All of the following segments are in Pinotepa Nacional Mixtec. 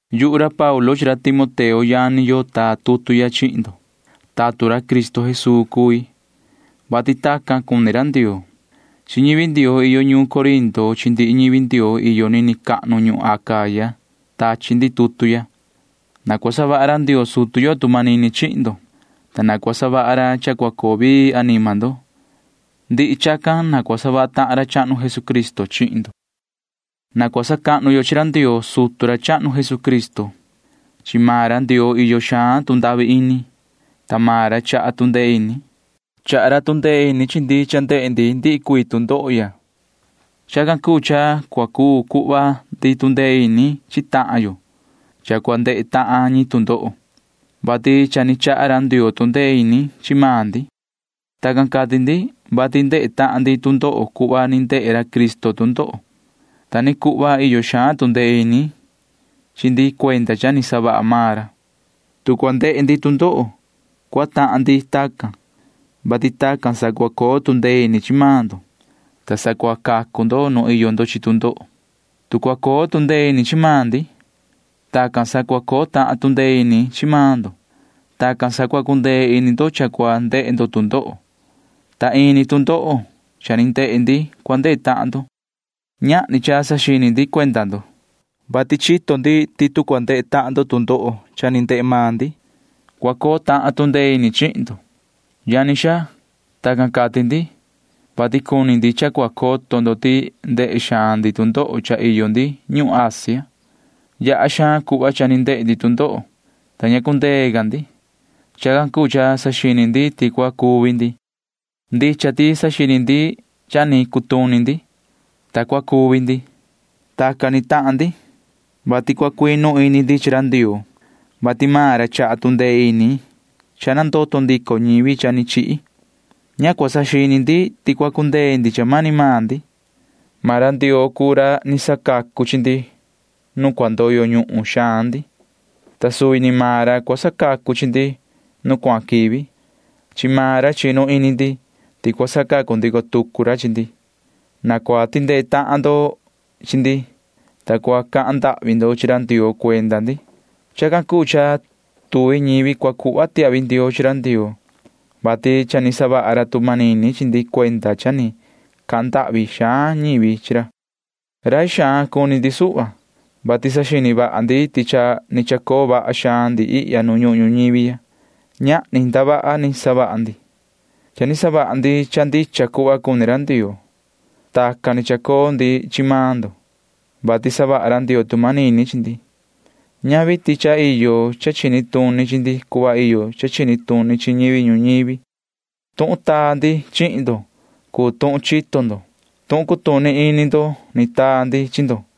Yuhu ra Paulu chi ra Timoteo yani yo taa tutu ya chihin ndo. Tatun ra Cristo Jesuu cui, vati tacan cuni ra Ndioo. Chi ñivi Ndioo iyo ñuun Corinto chi ndihi ñivi Ndioo iyo nini cahnu ñuhun Acaya tachi ndi tutu ya. Na cua savaha ra Ndioo sutu yo tu manini chihin ndo, ta na cua savaha ra cha cua coo vii anima ndo. Ndihi chacan ni na cua savaha tahan ra chahnu Jesucristo chihin ndo. Na cua sacahnu yo chi ra Ndioo sutu ra chahnu Jesucristo. Chi maan ra Ndioo iyo xaan tu ndahvi ini, ta maan ra chaha tu ndee ini. Chaha ra tu ndee ini chi ndi cha ndehe ndi ndihi cuii tu ndoho ya. Chacan cuu cha cua cuu cuhva ndi tu ndee ini chi tahan yo cha cua ndehe tahan ñi tu ndoho, vati cha ni chaha ra Ndioo tu ndee ini chi maan ndi. Tacan cati ndi, vati ndehe tahan ndi tu ndoho cuhva ni ndehe ra Cristo tu ndoho. Ta ni cuhva iyo xaan tu ndee ini chi ndi cuenda cha ni savaha maan ra. Tu cua ndehe ndi tu ndoho, cua tahan ndi tacan, vati tacan sa cua coo tu ndee ini chi maan ndo, ta sa cua cacu ndo nu iyo ndo chi tu ndoho. Tu cua coo tu ndee ini chi maan ndi, tacan sa cua coo tahan tu ndee ini chi maan ndo. Tacan sa cua cundee ini ndo cha cua ndehe ndo tu ndoho, ta ini tu ndoho cha ni ndehe ndi cua ndehe tahan ndo. Ñahni cha saxini ndi cuenda ndo, vati chito ndi ti tu cua ndehe tahan ndo tu ndoho cha ni ndehe maan ndi, cua coo tahan tu ndee ini chihin ndo. Yani xaa, tacan cati ndi, vati cuni ndi cha cua coto ndo ti ndehe xaan ndi tu ndoho cha iyo ndi ñuhun Asia. Yaha xaan cuhva cha ni ndehe ndi tu ndoho, ta ña cundee ca ndi. Chacan cuu cha saxini ndi ti cua cuvi ndi. Ndicha ti saxini ndi ti cha ni cutuni ndi, ta cua cuvi ndi. Tacan ni tahan ndi, vati cua cuinu ini ndi chi ra Ndioo, vati maan ra chaha tu ndee ini cha nandoto ndico ñivi cha ni chihi. Ña cua saxini ndi ti cua cundee ndi cha mani maan ndi. Maan ra Ndioo cuu ra ni sacacu chi ndi nuun cua ndoyo ñuhun xaan ndi, ta suvi ni maan ra cua sacacu chi ndi nu cuahan quivi. Chi maan ra chinu ini ndi ti cua sacacu ndico tucu ra chi ndi. Na cua tindee tahan ndo chi ndi, ta cua cahan ndahvi ndo chi ra Ndioo cuenda ndi. Chacan cuu cha tuvi ñivi cua cuhva tiahvi ndioo chi ra Ndioo, vati cha ni savaha ra tu manini chi ndi cuenda cha ni cahan ndahvi xaan ñivi chi ra. Rai xaan cuni ndi suhva, vati saxini vaha ndi ti cha ni chacoo vaha xaan ndi ihya nu ñuhun ñuñivi ya. Ñahni ndavaha ni savaha ndi. Cha ni savaha ndi cha ndicha cuhva cuni ra Ndioo. Tacan ni chacoo ndi chi maan ndo, vati savaha ra Ndioo tu manini chi ndi. Ñavi ti cha iyo cha chini tuni chi ndi cuhva iyo cha chini tuni chi ñivi ñuñivi. Tuhun taa ndi chihin ndo cuu tuhun chito ndo. Tuhun cutuni ini ndo ni taa ndi chi ndo,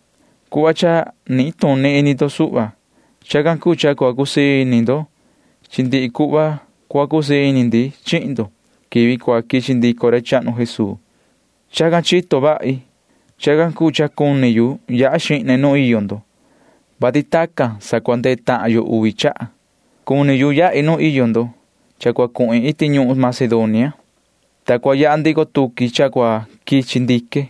cuhva cha nituni ini ndo suhva. Chacan cuu cha cua cusii ini ndo chi ndi cuhva cua cusii ini ndi chihin ndo quivi cua quichi ndico ra chahnu Jesuu. Chacan chito vahi. Chacan cuu cha cuni yu yaha xihne nu iyo ndo, vati tacan sa cua ndehe tahan yo uvi chaha. Cuni yahi nu iyo ndo cha cua cuhin iti ñuhun Macedonia, ta cua yaha ndico tuqui cha cua quichi ndique.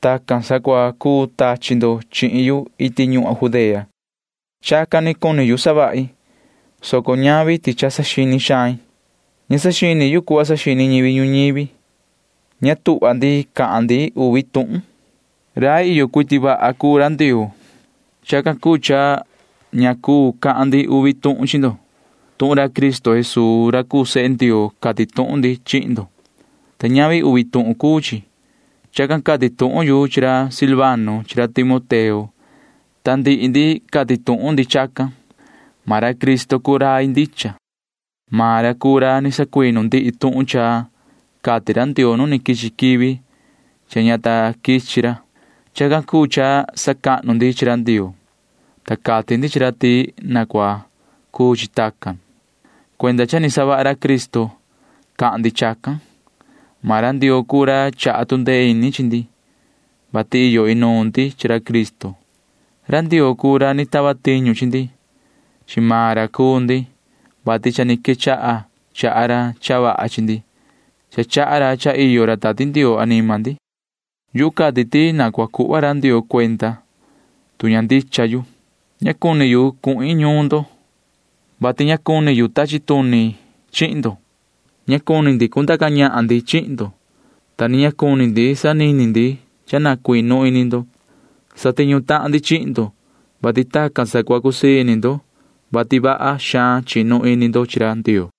Tacan sa cua cuu tachi ndo chihin yu iti ñuhun Judea. Chacan ni cuni savahi, soco ñavi ti cha saxini xain. Ña saxini yu cuhva saxini ñivi ñuñivi. Ña tuhva ndi cahan ndi uvi tuhun. Rai iyo cuiti vaha cuu ra Ndioo. Chacan cuu cha ña cuu cahan ndi uvi tuhun chi ndo. Tuhun ra Cristo Jesuu ra cuu sehe Ndioo cati tuhun ndi chihin ndo, ta ñavi uvi tuhun cuu chi. Chacan cati tuhun yu chi ra Silvano chi ra Timoteo, ta ndihi ndi cati tuhun ndi chacan. Maan ra Cristo cuu rai ndicha. Maan ra cuu ra ni sacuinu ndihi tuhun cha cati ra Ndioo nu ni quichi quivi cha ña ta quichi ra. Chacan cuu cha sacahnu ndi chi ra Ndioo, ta cati ndi chi ra ti na cua cuu chi tacan. Cuenda cha ni savaha ra Cristo cahan ndi chacan. Maan ra Ndioo cuu ra chaha tu ndee ini chi ndi, vati iyo inuun ndi chi ra Cristo. Ra Ndioo cuu ra ni tava tiñu chi ndi. Chi maan ra cuu ndi, vati cha ni quechaha chaha ra cha vaha chi ndi. Cha chaha ra cha iyo ra Tati Ndioo anima ndi. Yuhu cati ti na cua cuhva ra Ndioo cuenda, tu ña ndicha yu. Ña cuni yu cuhin ñuun ndo, vati ña cuni yu tachi tuni yu chihin ndo. Ña cuni ndi cundaca ñahan ndi chihin ndo, ta ni ña cuni ndi sanini ndi cha na cuinu ini ndo. Satiñu tahan ndi chihin ndo, vati tacan sa cua cusii ini ndo, vati vaha xaan chinu ini ndo chi ra Ndioo.